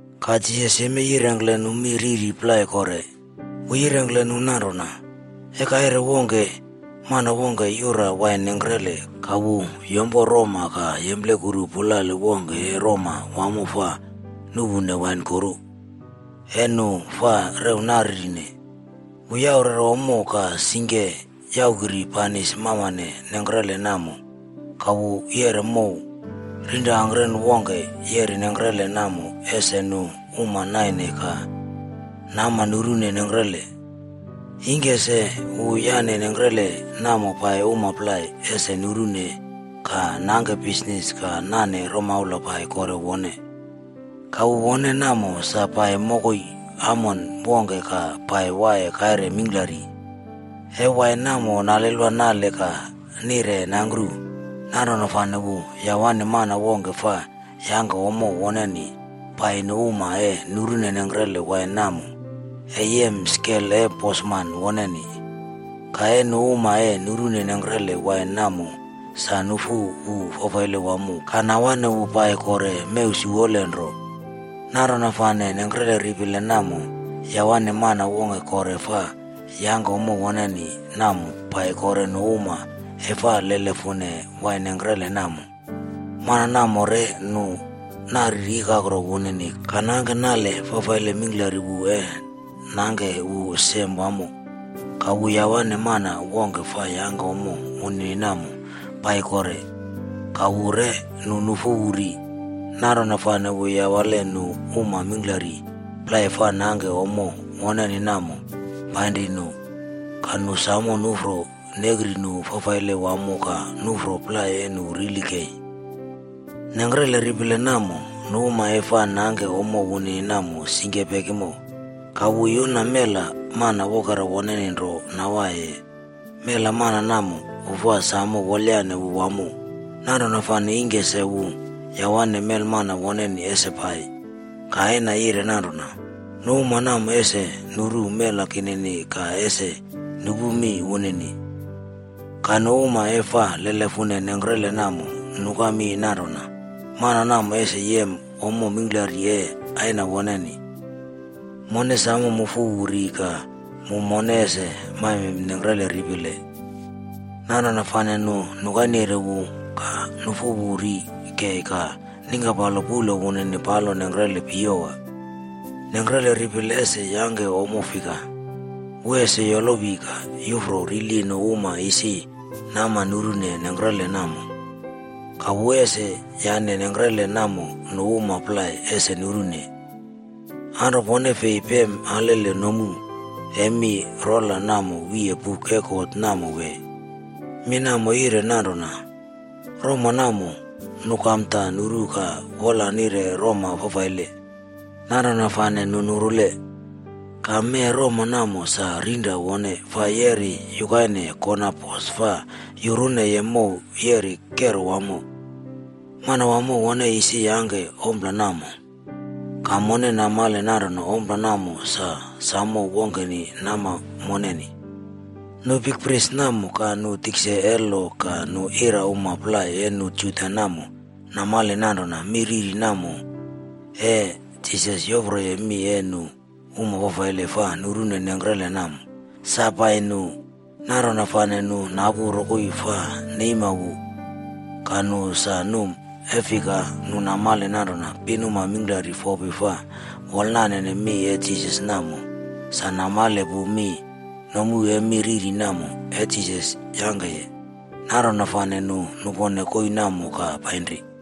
Ka Jisas yemei yirengkle nu mi riri plai kore. Wu yirengkle nu nanrona, “E kaire wongke, mana wongke yura wain nengkrele ka wu yompo roma ka yemplekuru pulale wongke e roma wamo fa nuꞌpu wain kuru e nu fa rew naririne. Wu yaurere ommo ka singke yungkre banis mamane nengkrele namo. Ka wu yeꞌre mow rirangkre wongke yeri nengkrele namo ese nu uma naine ka nama nurune nengkrele. Ingke se wu yane nengkrele namo pai uma plai ese nurune ka nangke bisnis ka nane romaula pai kore wone. Ka wu wone namo, sa pai mokoi amon wongke ka pai waiye kaire mingklari. E wain namo nalelwa nale ka nire nangkru. Nanrona fane wu yawane mana wongke fa yangke ommo woneni pai nu uma e nurune nengkrele wain namo e yem skel e bosman woneni. Ka nu uma e nurune nengkrele wain namo samo nufu wu fafaile wamo ka nawane wu pai kore mew siwolenro. Nanrona fane nengkre ripile namo, yawane mana wongke kore fa yangke ommo woneni namo pai kore nu uma e fa lelefune wain nengkre namo. Mana namo re nu nari ikakro wunini ka nangke nale fafaile mingklari wu e nangke wu sem wamo. Ka wu yawane mana wongke fa yangke ommo wunini namo pai kore. Ka wu re nu nufu wu ri. Nanrona fane wu yawale nu um mingklari plai fa nangke ommo woneni namo painri nu. Ka nu samo nufro nekri nu fafaile wamo ka nufro plai e nu rili kei.” “Nengkre ripile namo, nu uma e fa nangke ommo wunini namo singke pekimo. Ka wu yuna mel mana wokera woneni nro nawaiye. Mela mana namo, wu fa wolayane wu wamo. Nanrona fane ingke se wu yawane melmana woneni ese pai. Ka aina yire nanrona, ‘Nu uma namo ese nuru mela kinini ka ese nupu mi wunini.’” “Ka nu uma e fa lelefune nengkrele namo nuka mi nanrona, ‘Mana namo ese yem ommo mingklari e aina woneni. Mone samo mufu wu ri ka mu mone ese maime nengkre ripile.’ Nanrona fane nu nukaire wu ka nufu wu ri kei ka ningkapalo puꞌlo wunini palo nengkrele piyewa.” “Nengkre ripile ese yangke ompla fika? Wu ese yolowi ka yufro rili nu uma isi nama nurune nengkrele namo. Ka wu ese yane nengkrele namo nu uma plai ese nurune. Anro pone fei pem alele nomu e mi rola namo wiye buk e God namo wee? Mi namo yire nanrona, ‘Roma namo, nu kamda nuru ka wola nire roma fafaile. Nanrona fane nu nurule. Ka mee roma namo sa rinra wone fa yeri yukaine kona pos fa yuruneye mow yeri kero wamo. Manawamo wone isi yangke ompla namo, ka mone namale nanrona ompla namo sa samo wongkeni nama moneni.’” Nu bikpris namo ka nu tikse e lo ka nu ira uma plai e nu Juda namo namale nanrona mi riri namo e Jisas yoproye mi e nu uma fafaile fa nurune nengkre namo, sa pai nu. Nanrona fane nu napu rokoi fa neima wu. Ka nu sa numa e fika nu namale nanrona pin uma mingklari fopi fa wolnane mi e Jisas namo, sa namale pu mi nomu e mi riri namo e Jisas yangkeye. Nanrona fane nu nupone koii namo ka painri.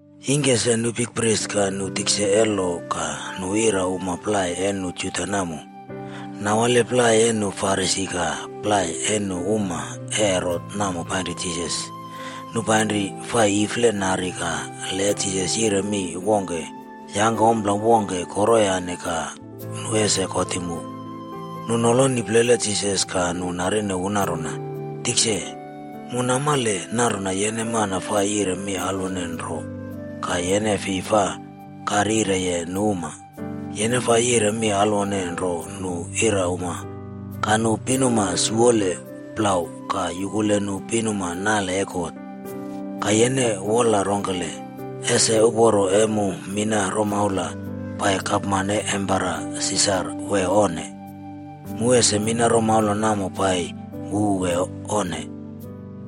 Ingke se nu bikpris ka nu tikse e lo ka nu ira uma plai e nu Juda namo, nawale plai e nu Farisi ka plai e nu uma e Herot namo painri Jisas. Nu painri fa ifle nari ka le Jisas yire mi wongke wee yangke ompla wongke koroyane ka nu ese kotim wu. Nu noloni plele Jisas ka nu narine wu nanrona, “Tikse, mu namale nanrona yene mana fa yire mi alwone nro ka yene fi fa karyireye nu uma. Yene fa yire mi alwone nro nu irauma ka nu pinuma siwole plau ka yukule nu pinuma nale e God. Ka yene wola rongkele, ese uporo e mu mina romaula pai gapman e Empera Sisar wee onne? Mu ese mina romaula namo pai wu wee onne?”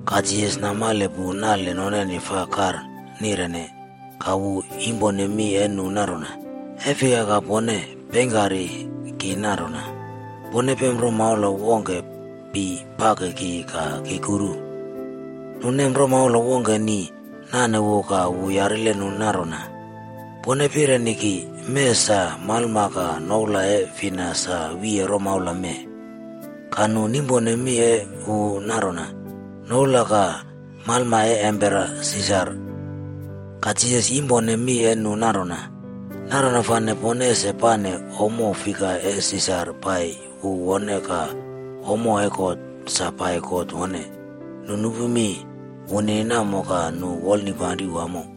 Ka Jisas namale pu nale noneni fa kar nirene, ka wu yimpone mi e nu nanrona, “E fika ka pone peingkari ki nanrona? Pone pem romaula wongke pi pake ki ka ki kuru.” Nu nem romaula wongke ni nane wu ka wu yarile nu nanrona, “Pone pireni ki, mee sa malma ka noula e fina sa wiye romaula mee?” Ka nu nimpone mi e wu nanrona, “Noula ka malma e Empera Sisar.” Ka Jisas yimpone mi e nu nanrona, “Nanrona fane pone ese pane ompla fika e Sisar pai wu wone ka ommo e God sa pai God wone.” Nu nupu mi wunini namo ka nu wolnipanri wamo.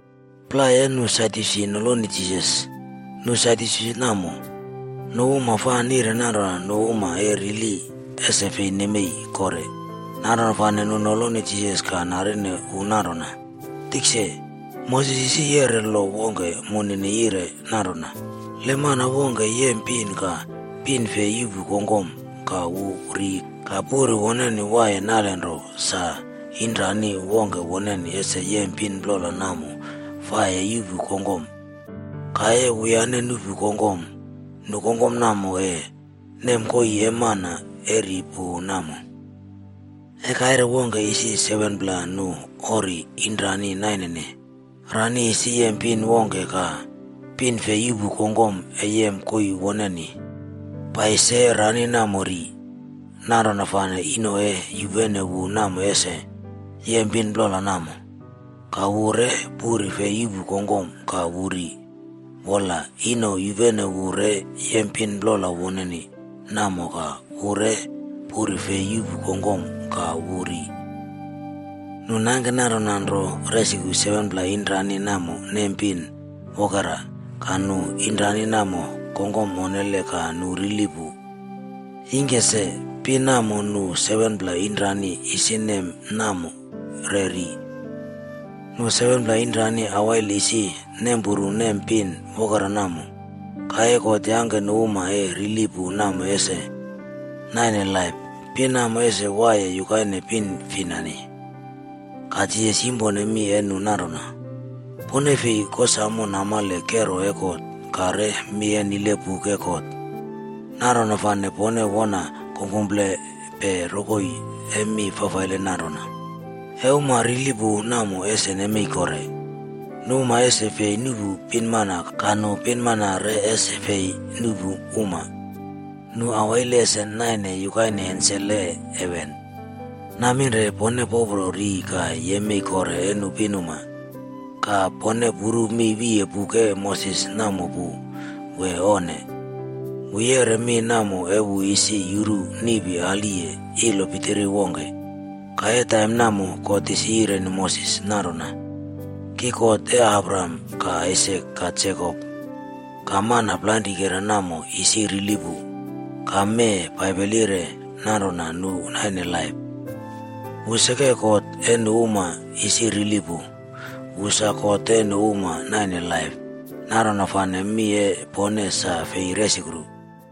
Plai e nu Sadyusi noloni Jisas. Nu Sadyusi namo, nu uma fa nire nanrona nu uma e rili ese fi nemei kore. Nanrona fane nu noloni Jisas ka narine wu nanrona, “Tikse, Moses isi yeꞌre lo wongke moneni yire nanrona, le mana wongke yem pin ka pin fi yuꞌpu kongkom ka wu ri ka puri woneni waiye nalenro sa, inrani wongke woneni ese yem pin plola namo fa e yuꞌpu kongkom. Ka e wuyane nuꞌpu kongkom, nu kongkom namo e nem koii e mana e ri pu namo. E kaire wongke isi 7pla nu ori inrani nainene. Rani isi yem pin wongke ka pin fi yuꞌpu kongkom e yem koii woneni. Pai se rani namo ri. Nanrona fane ino e yupene wu namo ese yem pin plola namo. Ka wu re puri fei yuꞌpu kongkom ka wu ri. Wola, ino yupene wu re yem pin plola wunini namo ka wu re puri fi yuꞌpu kongkom ka wu ri. Nu nangke nanrona nro resukru 7pla inrani namo nem pin wokera, ka nu inrani namo kongkom onnele ka nu rili pu. Ingke se, pin namo nu 7pla inrani isi nem namo re ri. Nu 7pla inrani awail isi nempuru nem pin wokera namo. Ka e God yangke nu uma e rili pu namo ese naine laip, pin namo ese waiye yukaine pin finani.” Ka Jisas yimpone mi e nu nanrona, “Pone fei kosamo namale kero e God ka re mi nile buk e God. Nanrona fane pone wona kungkumplepe rokoi e mi fafaile nananrona. E uma rili pu namo ese nemei kore, nu uma ese fi nuꞌpu pinmana ka nu pinmana re ese fi nuꞌpu uma. Nu awail ese naine yukaine ensel e heven.” “Naminre pone popro ri ka yemei kore e nu pinuma. Ka pone puru mi wiye buk e Moses namo pu wee onne? Wu yeꞌre mi namo e wu isi yuru niꞌpi aliye ilo pitiri wongke. Ka e taim namo, God isi yireni Moses nanrona, ‘Ki God e Abraham ka Aisak ka Jekop.’ Ka mana plainrikera namo isi rili pu, ka mee Baibel yire nanrona nu naine laip. Wu seke God e nu uma isi rili pu, wu sa God e nu uma naine laip. Nanrona fane mi e pone sa fi resukru.”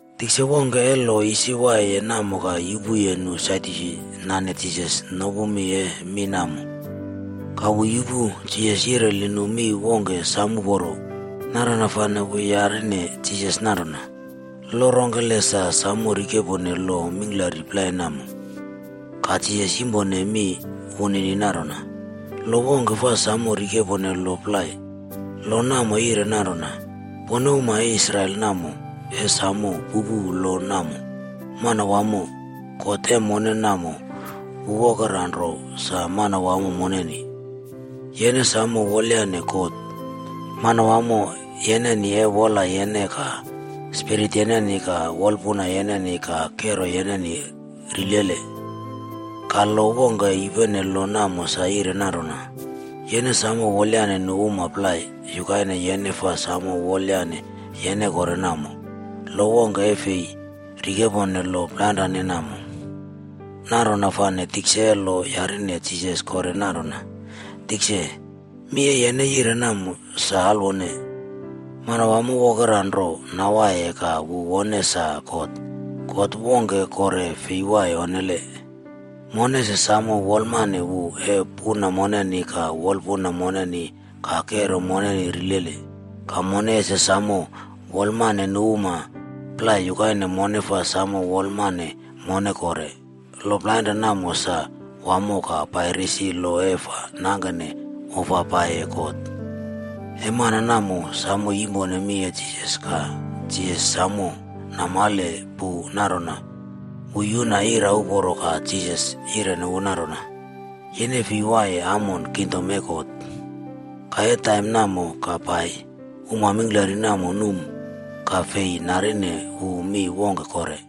Tisa wongke e lo isi waiyeye namo ka yupuye nu Sadyusi nane Jisas nopu mi e mi namo. Ka wu yupu Jisas yireli nu mi wongke sam uporo. Nanrona fane wu yarine Jisas nanrona, “Lo rongkele sa samo rikepone lo mingklari plai namo?” Ka Jisas yimpone mi wunini nanrona, “Lo wongke fa samo rikepone lo plai. Lo namo yire nanrona, Pone uma e Israel namo e samo pupu lo namo. Manawamo, God e mone namo, wu wokera nro sa Manawamo moneni. Yene samo wolayane God, Manawamo yeneni e wola yeneni ka spirit yeneni, ka wolpuna yeneni ka kero yeneni rilele.’ Ka lo wongke yupene lo namo sa yire nanrona, Yene samo wolayane nu uma plai yukaine yene fa samo wolayane yene kore namo.’ Lo wongke e fi rikepone lo plainrane namo.” Nanrona fane tikse e lo yireni Jisas kore nanrona, “Tikse, mi e yene yire namo sa alwone. Manawamo wokera nro nawaiye ka wu wone sa God. God wongke kore fi waiye onnele. Mone ese samo wolmane wu e puna moneni ka wolpuna moneni, ka kero moneni rilele. Ka mone ese samo wolamane nu uma plai yukaine mone fa samo wolamane mone kore. Lo plainrane namo sa wamo ka pai risi lo e fa nangke ofa paiye God.” E mana namo samo yimpone mi e Jisas ka Jisas samo namale pu nanrona wu yuna ira uporo ka Jisas yireni wu nanrona, “Yene fi waiye amon kingdom e God.” Ka e taim namo ka pai, uma mingklari namo num ka fei narine wu mi wongke kore.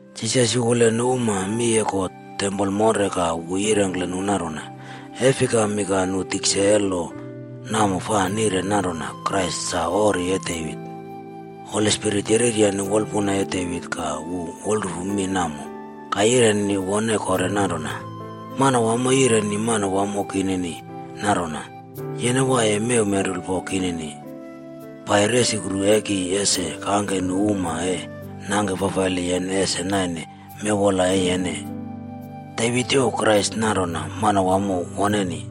Jisas yukule nu uma mi e God tempol monre ka wu yirengkle nu nanrona, “E fikami ka nu tikse e lo namo fa nire nanrona Krais sa ori e Devit? Holi Spirit yereryane wolpuna e Devit ka wu wolrufu mi namo ka yireni wone kore nanrona, Manawamo yireni Manawamo kinini nanrona, Yene waiye mew menrulpo kinini pai resukru e ki ese kangke nu uma e nangke fafaile yene ese naine mewwola e yene.”’” “Devit youw Krais nanrona Manawamo woneni.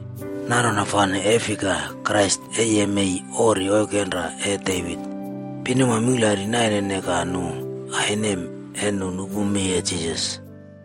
Nanrona fane e fika Krais e yemei ori oikenra e Devit?” Pinuma mingklari nainene ka nu ainem e nu nupu mi e Jisas.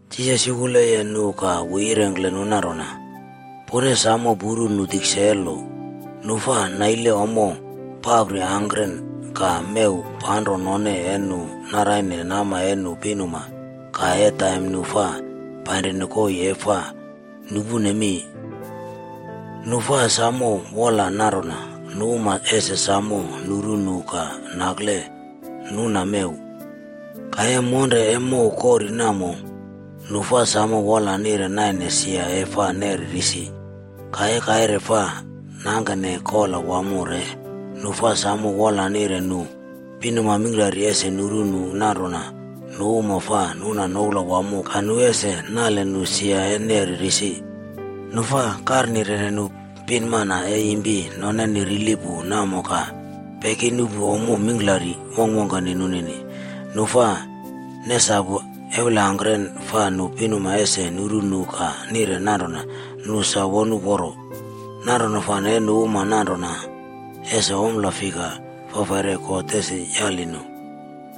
Jisas yukuleye nu ka wu yirengkle nu nanrona, “Pone samo puru nu tikse e lo. Nu fa naile ommo papri angkren ka mew panro none e nu naraine nama e nu pinuma ka e taim nu fa painrine koii e fa nupune mi. Nu fa samo wola nanrona, nu uma ese samo nuru nu ka nakle nuna mew. Ka e monre e mow kori namo, nu fa samo wola nire naine sia e fa neri risi. Ka e kaire fa nangkene kola wamo re, nu fa samo wola nire nu pinuma mingklari ese nuru nu nanrona nu uma fa nuna noula wamo ka nu ese nali nu sia e neri risi. Nu fa karnirene nu pinmana e impi noneni rili pu namo ka peki nupu ommo mingklari wongkwongkeni nunini. Nu fa nesapu eulangkren fa nu pinuma ese nuru nu ka nire nanrona nu sa won uporo. Nanrona fane nu uma nananrona, ese ompla fika fafaire God ese yali nu,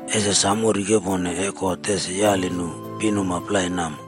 ese samo rikepone e God ese yali nu pinuma plai namo.”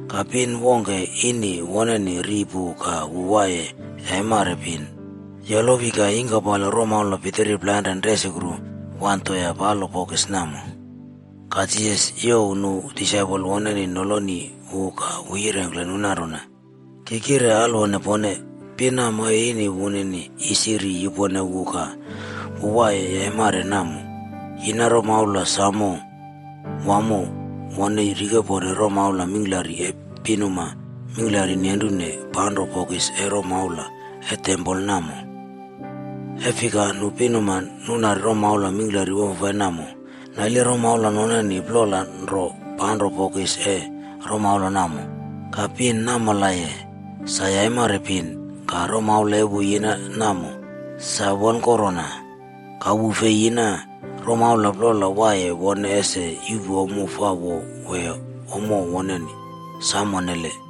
Ka pin wongke ini woneni ri pu ka wu waiye yaimar pin, yolowi ka yingkapalo romaula pitiri plainren resukru wan toea palo bokis namo. Ka Jisas youw nu disaipol woneni noloni wu ka wu yirengkle nu nanrona, “Ki kire alwone pone. Pin namo e ini wunini isi ri yupone wu ka wu waiye yaimari namo, yina romaula sam wamo wone rikepone romaula mingklari e pinuma mingklari nenru panro bokis e romaula e tempol namo. E fika nu pinuma nunari romaula mingklari wamfafai namo, naile romaula noneni plola nro panro bokis e romaula namo. Ka pin namolaiye, sa yaimari pin, ka romaula e wu yina namo, sa wonkonrona. Ka wu fei yina romaula plola waiye wone ese yuꞌpu ommo fa wo wee ommo woneni. Sam onnele!”